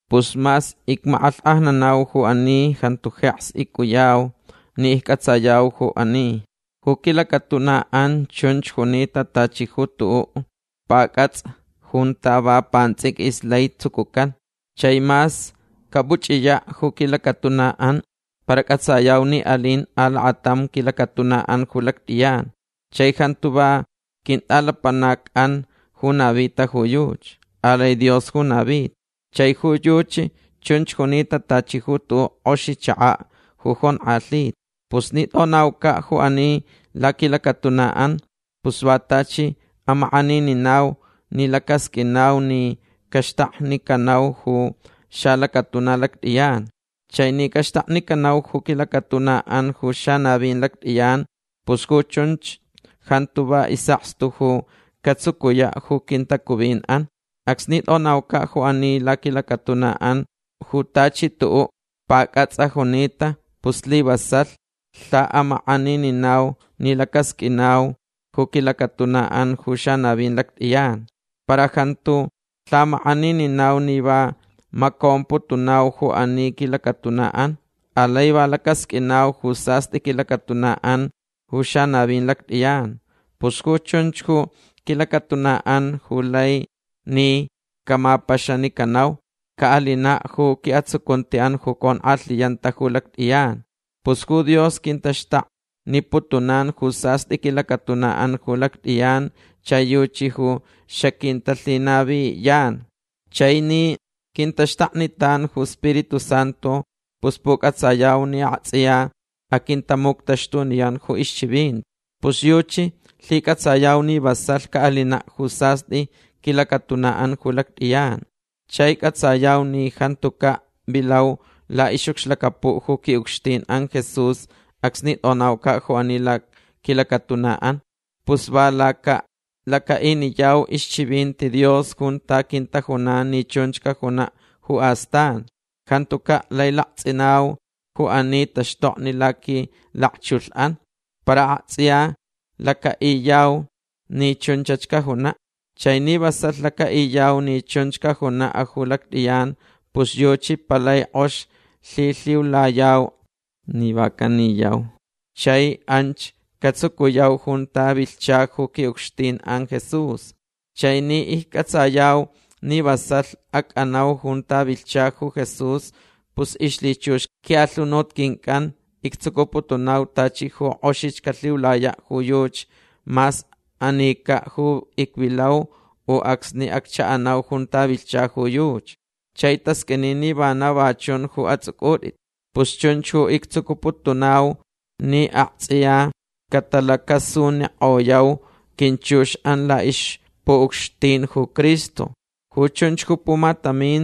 Pus mas icmakʼalhkʼajnanau ju ani jantu jeks icʼuyau ni iccʼatsayau ju ani. Ju quilacatunaʼan chunch junita tachi ju tuʼuʼ pacʼatsʼa junta va pantsʼiquis lai tsucucan. Chai mas capuchʼiyaʼ ju quilacatunaʼan para cʼatsayau ni alin alakatam quilacatunaʼan ju lactʼiyan. Chai jantu va quintʼalapanacʼan ju navita ju yuchi. Alai Dios ju navita. Chai ju yuchi chunch junita tachi ju tuʼuʼ kʼoxi chakaʼ ju jonkʼalhita. Pus ni tʼonaucaʼ ju ani laquilacatunaʼan pus va tachi amakʼanininau ni lacasqʼuinau ni caxtaknicanau ju xalacatuna lactʼiyan. Chai ni caxtaknicanau ju quilacatunaʼan ju xanavin lactʼiyan pus ju chunch jantu va isʼakstu ju catsucuyaʼ ju quintacuvinʼan. Acsni tʼonaucaʼ ju ani laquilacatunaʼan ju tachi tuʼuʼ pacʼatsʼa junita pus slivasalh lhaʼamakʼanininau ni lacasqʼuinau ju quilacatunaʼan ju xanavin lactʼiyan. Para jantu lhamakʼanininau ni va macomputunauch ju ani quilacatunaʼan. Alai va lacasqʼuinau ju sastʼi quilacatunaʼan ju xanavin lactʼiyan. Pus ju chunch ju quilacatunaʼan ju lai ni camapaxanicanauch. Caʼalinaʼ ju quiʼatsucuntiʼan ju conkʼalhiyanta ju lactʼiyan. Pus ju Dios quintaxtakniputunan ju sastʼi quilacatunaʼan ju lactʼiyan chai yuchi ju xaquintalhinaviyan. Chai ni quintaxtaknitan ju Spiritu Santu pus pucʼatsayau ni aktsʼiya aquintamuctaxtuniyan ju ixchivinti. Pus yuchi lhicʼatsayau ni vasalh caʼalinaʼ ju sastʼi quilacatunaʼan ju lactʼiyan. Chai cʼatsayau ni jantucaʼ vilau laʼixʼucxlacapuʼ ju quiʼucxtinʼan Jesús acsni tʼonaucaʼ ju ani laquilacatunaʼan. Pus va lacaʼiniyau ixchivinti Dios junta quintajunan ni chunch cajunaʼ ju astan. Jantucaʼ lai laktsʼinau ju ani taxtokni laquilakchulhʼan. Para aktsʼiya lacaʼiyau ni chunchach cajunaʼ. Chai ni vasalh lacaʼiyau ni chunch cajunaʼ ju lactʼiyan pus yuchi palai kʼox lhilhiulayau ni va caniyau chai anch catsucuyau junta vilhcha ju quiʼucxtinʼan Jesús. Chai ni iccʼatsayau ni vasalh acʼanau junta vilhcha ju Jesús pus ixlhichux quiʼalhunut quincʼan ictsucuputunau tachi ju kʼoxich calhiulayaʼ ju yuchi mas anicaʼ ju icvilau u acsni acchaʼanau junta vilhcha ju yuchi. Chai tasqʼuini ni vana va chun ju atsʼucʼutʼit. Pus chunch ju ictsucuputunau ni aktsʼiya catalacasunikʼoyau quinchuxʼan laʼixpuʼucxtin ju Cristo. Ju chunch ju pumatamin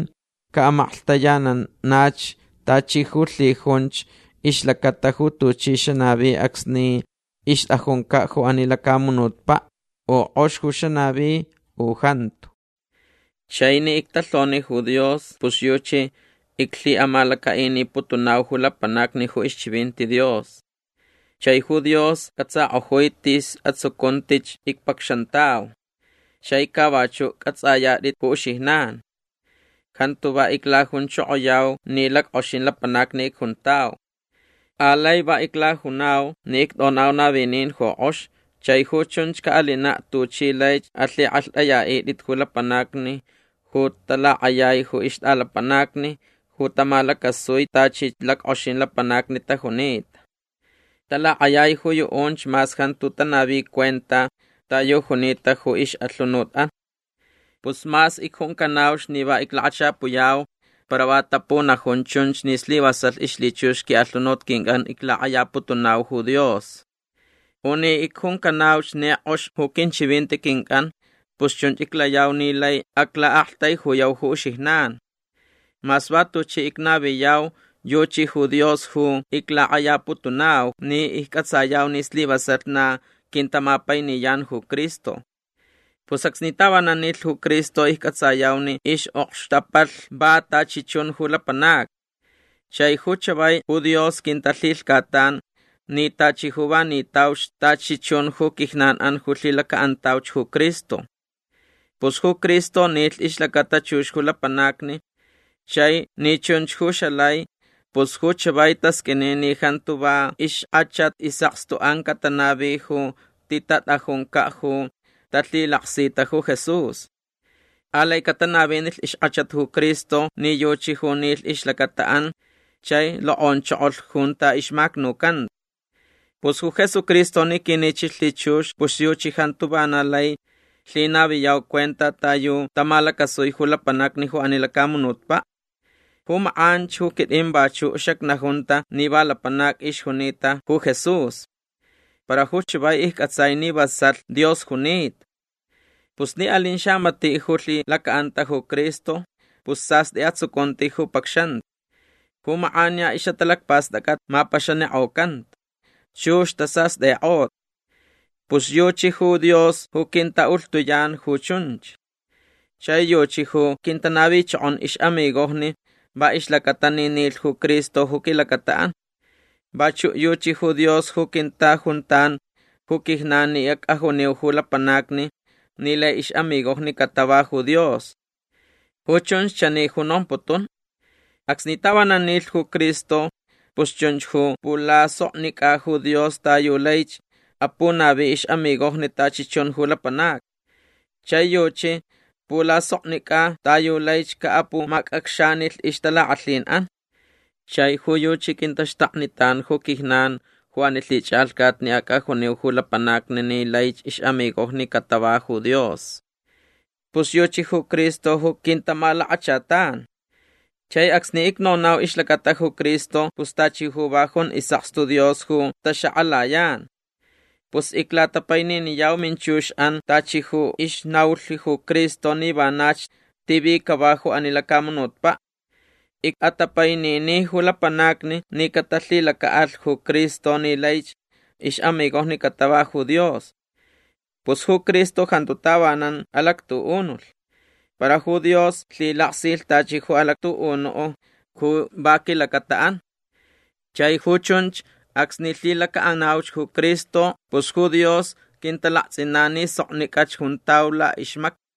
caʼamaklhtayananach tachi ju lhijunch ixlacata ju tuchi xanavi acsni ixtʼajuncaʼ ju ani lacamunutpaʼ u kʼox ju xanavi u jantu. Chai ni ictalhoni ju Dios pus yuchi iclhiʼamalacaʼiniputunau ju lapanacni ju ixchivinti Dios. Chai ju Dios cʼatsakʼojui tis atsucuntich icpacxantau. Chai ca vachuʼ cʼatsʼayatʼit ju uxijnan. Jantu va iclajunchokoyau ni lackʼoxin lapanacni icjuntau. Alai va iclajunau ni ictʼonau navinin ju kʼox chai ju chunch caʼalinaʼ tuchi laich alhikʼalhtʼayaʼitʼit ju lapanacni ju talakʼayai ju ixtʼalapanacni ju tamalacasui tachi lackʼoxin lapanacni tajunita. Talakʼayai ju yuʼunch mas jantu tanavi cuenta ta yu junita ju ixʼalhunutʼan. Pus mas icjuncanauch ni va iclakachapuyau para va tapunajun chunch ni slivasalh ixlhichux quiʼalhunut quincʼan iclakʼayaputunau ju Dios. U ni icjuncanauch ni kʼox ju quinchivinti quincʼan pus chunch iclayau ni lai aclaʼaktaijuyau ju uxijnan. Mas va tuchi icnaviyau yuchi ju Dios ju iclakʼayaputunau ni iccʼatsayau ni slivasalh na quintamapainiyan ju Cristo. Pus acsni tavanan nilh ju Cristo iccʼatsayau ni ixʼokxtapalh va tachi chun ju lapanacni. Chai ju chavai ju Dios quintalhilhcatan ni tachi ju va nitauch tachi chun ju quijnanʼan ju lhilacaʼantauch ju Cristo. Pus ju Cristo nilh ixlacata chux ju lapanacni. Chai ni chunch ju xalai pus ju chavai tasqʼuini ni jantu va ixkʼachat isʼakstuʼan catanavi ju titatʼajuncaʼ ju talhilaksita ju Jesús. Alai catanavinilh ixkʼachat ju Cristo ni yuchi ju nilh ixlacataʼan chai lokʼonchokolh junta ixmacnucanta. Pus ju Jesucristo ni quinichilh lhichux pus yuchi jantu vana lai lhinaviyau cuenta ta yu tamalacasui ju lapanacni ju ani lacamunutpaʼ. Ju makʼanch ju quitʼin vachuʼ xacnajunta ni va lapanac ixjunita ju Jesús. Para ju chavai iccʼatsai ni vasalh Dios junita. Pus ni alin xamatiʼ ju lhilacaʼanta ju Cristo pus sastʼi atsucunti ju pacxanta. Ju makʼaniya ixʼatalacpastʼacʼat mapaxanikʼocanta. Chux tasastʼikʼota. Pus yuchi ju Dios ju quintaʼulhtuyan ju chunch. Chai yuchi ju quintanavichokon ixʼamigojni va ixlacata ni nilh ju Cristo ju quilacataʼan. Vachuʼ yuchi ju Dios ju quintajuntan ju quijnan ni acʼajuniu ju lapanacni ni lai ixʼamigojni catava ju Dios. Ju chunch chani ju nomputun. Acsni tavanan nilh ju Cristo pus chunch ju pulasoknicʼa ju Dios ta yu laich apunavi ixʼamigojni tachi chun ju lapanacni. Chai yuchi pulasoknicʼa ta yu laich caʼapumacʼacxanilh ixtalakʼalhinʼan. Chai ju yuchi quintaxtaknitan ju quijnan ju ani lhichʼalhcat ni acʼajuniu ju lapanacni ni laich ixʼamigojni catava ju Dios. Pus yuchi ju Cristo ju quintamalakachatan. Chai acsni icnonau ixlacata ju Cristo pus tachi ju va jun isʼakstu Dios ju taxakʼalayan. Pus iclatapaininiyau minchuxʼan tachi ju ixnaulh ju Cristo ni vanach tivi cava ju ani lacamunutpaʼ. Icʼatapainini ju lapanacni ni catalhilacaʼalh ju Cristo ni laich Ixʼamigojni catava ju Dios. Pus ju Cristo jantu tavanan alactuʼunulh. Para ju Dios lhilaktsʼilh tachi ju alactuʼunuʼ ju va quilacataʼan. Chai ju chunch acsni lhilacaʼanauch ju Cristo pus ju Dios quintalaktsʼinan ni soknicʼach juntau laʼixmacni.